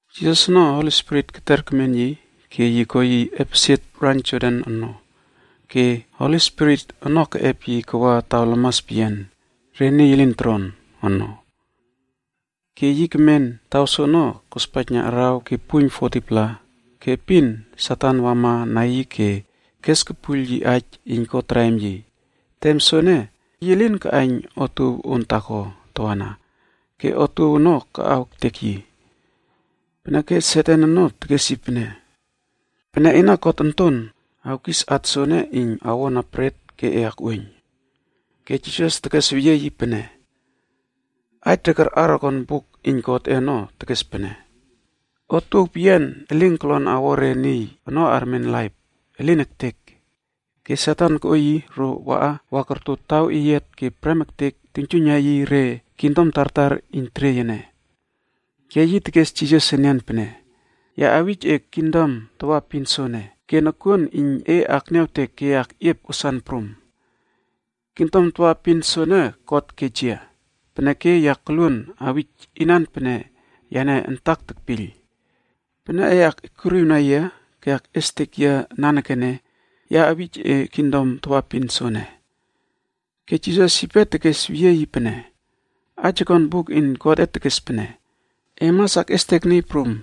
Jisas ono, Holi Spirit keter kemen yi ke ko yi epesie raiyn Jordan ono ke Holi Spirit ono keꞌep yi kawa taw lamas peyian re niy elin toron ono. Ke yi kemen taw soono kospaijna araw ke puiyn 40-pla ke epin Satan wamana yi ke kes kepuiyl yi aij iyn ko traim yi. Tem soene, yi lin kaꞌaiyn otuow on taako tawana ke otuow ono kaꞌaw ektek yi. Peneke Satan ono tekes yi pene, “Pene ena God Onton Wuruaw, awkis at soene iyn awona bret ke e akꞌuoiyn.” Ke Jisas tekesweyie yi pene, “Aij re karꞌar okon Buk iyn Godꞌe ono tekes pene, ‘Otuow peyian elin kolon awo re niy ono armen laip. Ke Satan koꞌo yi ro waꞌa wa korto taw eyiat ke prem ektek yi tuiynjuiyna yi re kingdom tartar iyn teriey ene. Ke yi tekes Jisas enian pene, “Ya awij e kingdom tawaepin soene ke nokuon iyn e akniawtek ke e akꞌiep wasan prum. kingdom tawaepin soene God kej yia, peneke ya koluon awij inan pene yane antak tekpiyl. Pene e akꞌiekuriwna yia ke akꞌiestek yia nanekene, ya awij e kingdom tawaepin soene.” Ke Jisas yipe tekesweyie yi pene, “Aij okon Buk iyn Godꞌe tekes pene, ‘E mas akꞌiestek Niy Prum,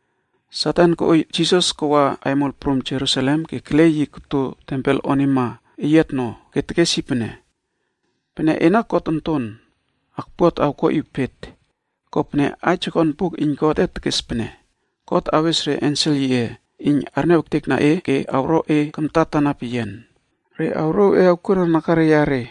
Satan koꞌo Jisas kawa aimol prum Jerusalem ke kele yi koto tempel onima eyiatno ke tekes yi pene, “Pene ena God Onton Wuruaw, ekpuat awkuaꞌiw pet. Kopene aij okon Buk iyn Godꞌe tekes pene, ‘God awes re ensel yiꞌe iyn arniaw ektekna e ke awro e kamtatana peyian. Re awrouw e awkuona nakare yare,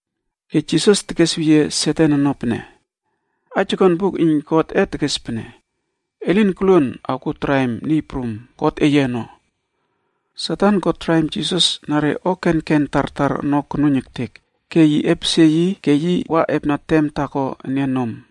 Ke Jisas tekesweyie Satan ono pene, “Aij okon Buk iyn Godꞌe tekes pene, ‘E lin koluon awkuo traim Niy Prum, Satan ko traim Jisas na re o kenken tartar ono konuiyn ektek, ke yi epesie yi ke wa epna tem taako enian nom.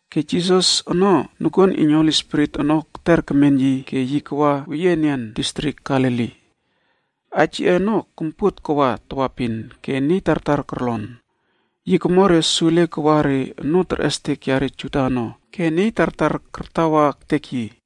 Ke Jisas ono nokuon iyn Holi Spirit ono keter kemen yi ke yi kawa weyie enian distrik Galili. Aij yiꞌe ono kompuot kawa tawaepin ke niy tartar korlon. Yi komo re sule kawa re onoo terꞌestek yare Juda ono ke niy tartar kartawa ektek yi.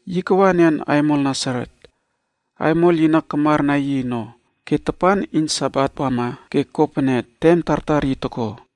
Yi kawa enian aimol Nasaret. Aimol yi na kamar na yi ono, ke tapan iyn Sabate wama ke ko pene tem tartar yi toko,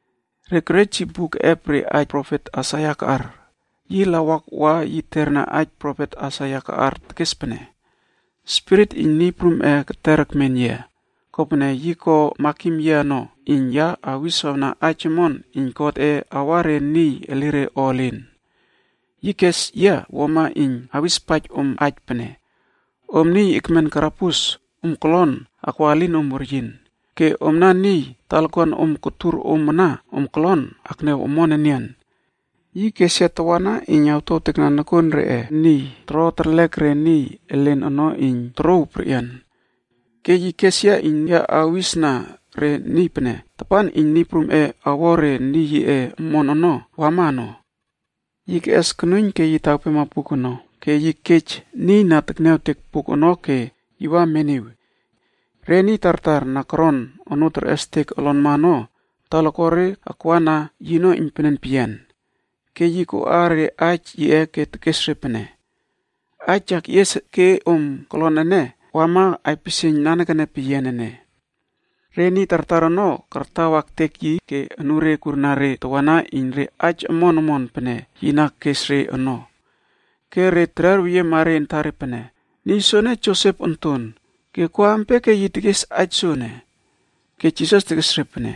Re kerej yi buk keꞌep re aij profet Aisaia kaꞌar. Yi lawak wa yi terna aij profet Aisaia kaꞌar tekes pene: “Spirit iyn Niy Prumꞌe keter ekmen yia, kopene yi ko makim yia ono iyn ya awiswawna aij omon iyn Godꞌe awa re niy elire o elin. Yi kes yia wuama iyn awispaij om aij pene, ‘Om niy ekmen karabus, om kolon akwa elinom weryin, ke omna niy talakuan om kotur om ana, om kolon akniaw omon enian.’ Yi kes yia tawana iyn awtuawtekna nokuon reꞌe niy toro terlek re niy elen ono iyn torouw perꞌian. Ke yi kes yia iyn ya awistekna re niy pene tapan iyn Niy Prum awo re niy yiꞌe omon ono, Yi keꞌes konuiyn ke yi tawpema buk ono ke yi kej niy na tekniawtek buk ono ke yi wa meniwi. Re niy tartar na koron onoo terꞌestek olonma ono talakuare akwa na yino iynpenen peyian. Ke yi koꞌa re aij yiꞌe ke tekes re pene, “Aij ya keꞌies ke om kolon ene, wama aipisieiyn nanekene peyian ene.” Re niy tartar ono kartawa ektek yi ke anure kurna re tawana iyn re aij omon omon pene yi na kes re ono. Ke re tererweyiema re antare pene, “Niy soene Josep onton, ke ko ampia yi tekes aij sopene?” Ke Jisas tekes re pene,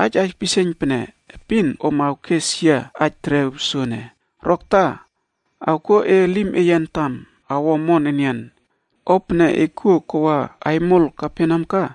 “Aij aipisieiyn pene, epin om awkes yia aij terew soene: ‘Rokta, awkuo e elim eye antam awo omon enian. O pene e kuo kawa aimol Kaperneam ka,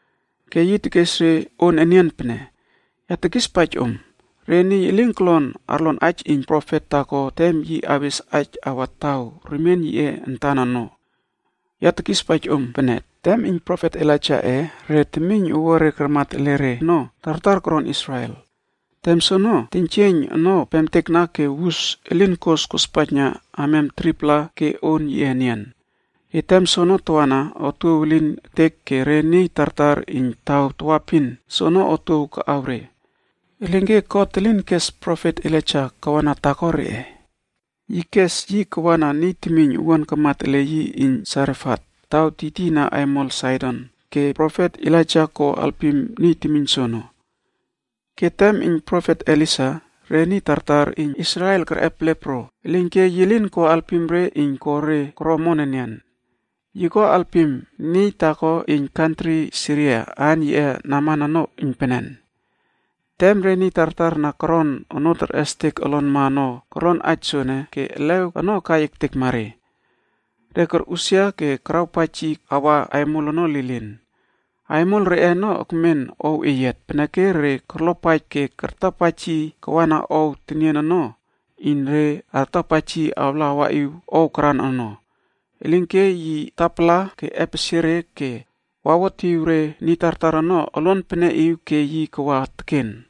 Ke yi tekes re on enian pene, “Ya tekispaij om, re niy elin kolon arlon aij iyn profet taako tem yi awes aij awa taw remien yiꞌe antan ono. Ya tekispaij om pene, tem iyn profet Elaijaꞌe re temiyn owuare karmat ele re ono tartar koron Israel. Tem soono, teiynjieiyn ono pemtekna ke wus elin kos kospaijna amiam 3-pla ke on yiꞌe enian. Ke tem soono tawana otuow elin ektek ke re niy tartar iyn taw tawaepin soono otuow kaꞌaw re. Elinke God elin kes profet Elaija kawana taako reꞌe. Yi kes yi kawana niy temiyn owuan kamat ele yi iyn Sarefatk taw tiytiyna aimol Saidon ke profet Elaija ko alpim niy temiyn soono. Ke tem iyn profet Elisa, re niy tartar iyn Israel ono, kerꞌep lepro.l Elinke yi lin ko alpim re iyn ko re elire ono kelwen enian. Yi ko alpim niy taako iyn kantri Siria aan yiꞌe Naman ono iynpenen peyian.” Tem re niy tartar na koron onoo terꞌestek olonma ono korlon aij soene ke elew ono kai ektekma re. Re korꞌusia ke karawpaij yi awa aimol ono lilin. Aimol reꞌe ono ekmen ow eyiat, peneke re korlopaij ke kartapaij yi kawana ow tenien ono iyn re artapaij yi awla awaꞌiw ow karan ono. Elinke yi tapala ke epesie re ke wawotiw re niy tartar ono oluan peneꞌiw ke yi kawa teken.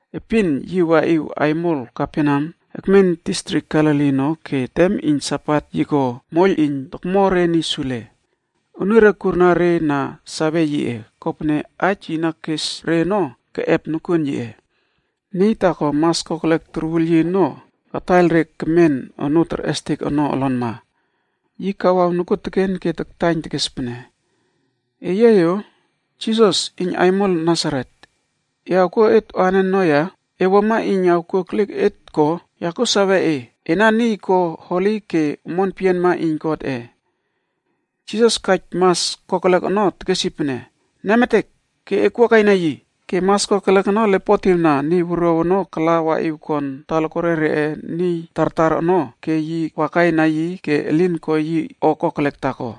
Epin yi waꞌiw aimol Kaperneam ekmen distrik Galili ono ke tem iyn Sabat yi ko moiyl iyn tokmo re niy sule. Anure kurna re na sawe yiꞌe, kopene aij yi na kes re ono keꞌep nokuon yiꞌe. Niy taako mas kokelek torwul yi ono kataiyl re kemen onoo terꞌestek ono olonma. Yi kawaw nokuoteken ke taktaiyn tekes pene, “Eyia yo! Jisas iyn aimol Nasaret, e awkuo et anen ono ya? E wuama iyn awkuo ekliek ektekma et ko? Ya kuo sawe ena inan. Ena Niy kuo Holi ke God antan kespaij e iyn wuama.” Jisas kaij orkurma mas kokelek ono tekes yi pene, “Nemetek, ke ekwua kaina yi!” Ke mas kokelek ono lepotiwna niy wuruaw ono kala waꞌiw kon talakuare reꞌe niy tartar ono ke wakaina yi ke elin ko yi o kokelek taako.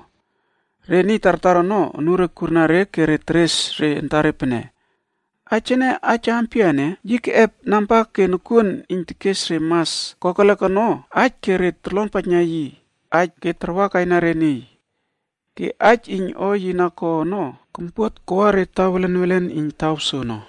Re niy tartar ono anure kurna re ke teres re antare pene, “Aij ene, aij ampia ene? Yi keꞌep namba ke nokuon iyn yi tekes re mas kokelek ono aij ke re torlonpaijna yi aij ke tarwa kaina re niy.” Ke aij iyn o yi na ko ono kompuot kawa re taw welen welen iyn taw soono.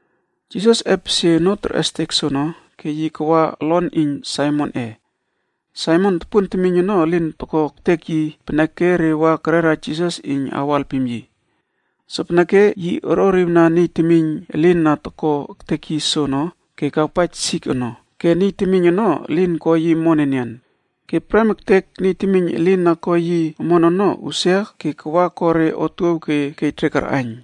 Jisas epesie onoo terꞌestek soono, ke yi kawa olon iyn Saimonꞌe. Saimon tupun temiyn ono elin toko ektek yi peneke re wa kerera Jisas iyn awo alpim yi. Sopeneke yi orꞌoriwna niy temiyn elin na toko ektek yi soono ke yi keꞌeiyl sik ono ke niy temiyn ono elin ko yi omon enian. Ke prem ektek niy temiyn elin na ko yi omon ono, usia ke wa ko re otuow ke kej re karꞌaiyn.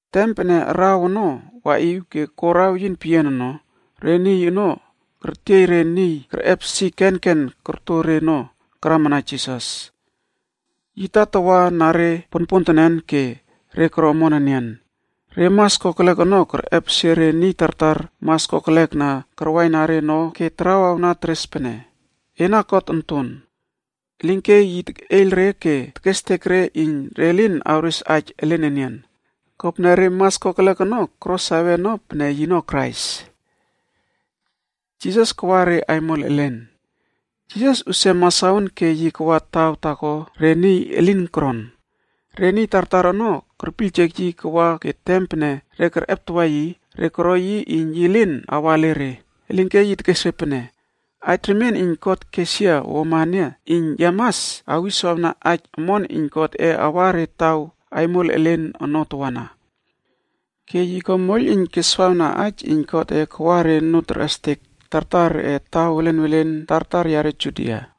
Tem pene araw ono waꞌiw ke ko raweyin peyian ono, re niy ono kertiey re niy kerꞌep sik kenken korto re ono, karamana Jisas. Yi tatawa na re ponpontenen ke re koro omon enian. Re mas kokelek ono kerꞌepesie re niy tartar mas kokelek na karwaina re ono ke tarawawna teres pene, “Ena God Onton Wuruaw.” Elinke yi tekꞌeiyl re ke tekestek re iyn re lin awres aij elen enian. Kopene re mas kokelek ono koro sawe ono pene yino Krais. Jisas usia masaon ke yi kawa taw taako re niy elin toron. Re niy tartar ono kerpiyljek yi kawa ke tem pene re kerꞌeptawa yi, re koro yi iyn yi lin awa ele re. Elinke yi tekes re pene, “Aij remien iyn God kes yia wuama ene iyn ya mas awiswawna aij omon iyn kingdom yiꞌe ono awa re aimol elen ono tawana.” Ke yi ko moiyl iyn keswawna aij iyn Godꞌe kawa re onoo terꞌestek tartar reꞌe taw welen welen tartar yare Judia.